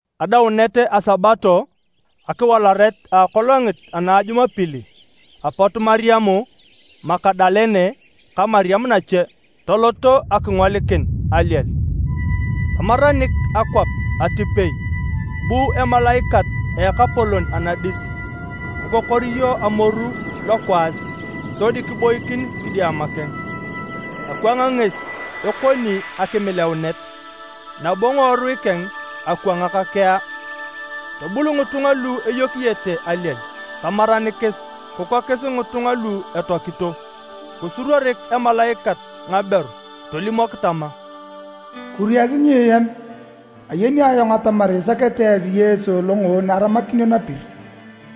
Adaunet a Sabato, akiwalaret a akolongit ana a Jumapili, apot Mariam Magadalene ka Mariam nache toloto akingolikin aliel. Tamaranik akwap atipei bu emalaikat a Ekapolon anadis kikokoriyo amoru lokwaas sodi kiboikin kidiama keng. Akwang ngesi ekoni akimileaunet, nabo ngiworui keng akwangak kea. Tobul ngitunga lu eyokiyete aliel tamaranikis, kikokis ngitunga lu etoakito. Kisuruorik emalaikat ngaberu tolimok tama, “Kuriasi nyieam, ayeni ayong atamar isakete esi Yesu lo ngoon aramakinio napir.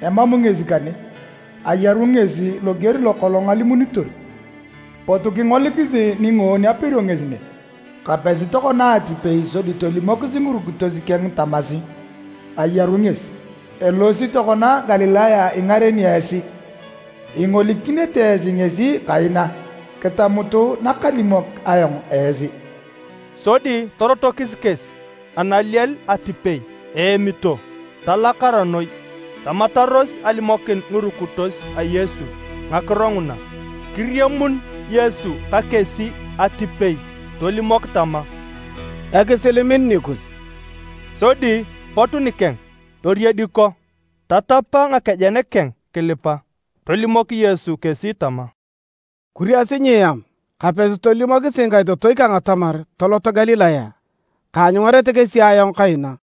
Emam ngesi kane, ayaru ngesi loger lokolong alimunitor. Potu kingolikisi ni ngoon aperio ngesi ne. Kapesi tokona atipei sodi tolimokis ngirukitos keng tamasi: ‘Ayaru ngesi.’ Elosi tokona Galilaya ingareni esi. Ingolikinete esi ngesi kaina. Kitamutu nakalimok ayong esi.” Sodi torotokis kesi analiel atipei eemito, talakara noi. Tamataros alimokin ngirukitos a Yesu ngakiro nguna. Kiriamun Yesu ka kesi atipei tolimok tama, “Ekisil min nikus.” Sodi pot nikeng toriediko, tatapa ngakejen keng kilipa. Tolimok Yesu kesi tama, “Kuriasi nyieam. Kapesi tolimokisi ngikaitotoi kang atamar toloto Galilaya, kaanyungarete kesi ayong kaina.”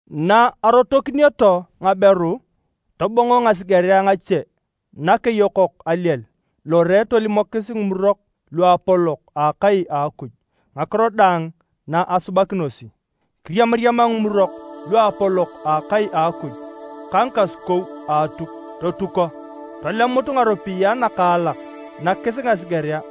Na arotokinioto ngaberu, tobongo ngasigerea ngache nakeyokok aliel lore tolimokis ngimurok luapolok a akai a Akuj ngakiro daang na asubakinosi. Kiriamariama ngimurok luapolok a akai a Akuj ka ngikasukou a Atuk, totuko. Tolemut ngaropiyae nakaalak nakis ngasigerea.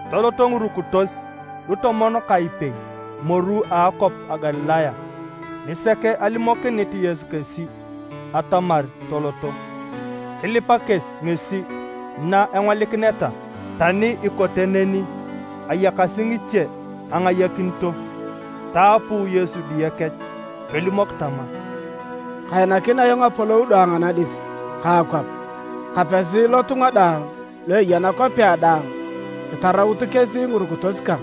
Toloto ngirukitos lutomon ka epei moru a akwap a Galilaya nisek alimokinit Yesu kesi atamar toloto. Kilipa kesi ngesi na engolikineta, tani ikote neni, ayakasi ngiche angayakinito. Taapu Yesu diye kech tolimok tama, “Kainakin ayong apolou daang anadis ka akwap. Kapesi lotunga daang lu eya nakwapea daang kitaraut kesi ngirukitos kang,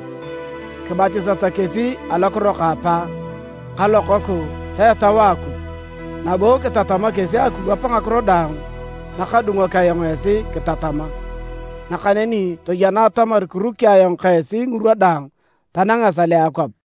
kibatisata kesi alokiro ka Apa ka Lokoku ta Etau a Akuj. Nabo kitatama kesi akiwap ngakiro daang nakadungok ayong esi kitatama. Nakaneni toyena atamar kiruki ayong ka esi ngirwa daang tanang esal a akwap.”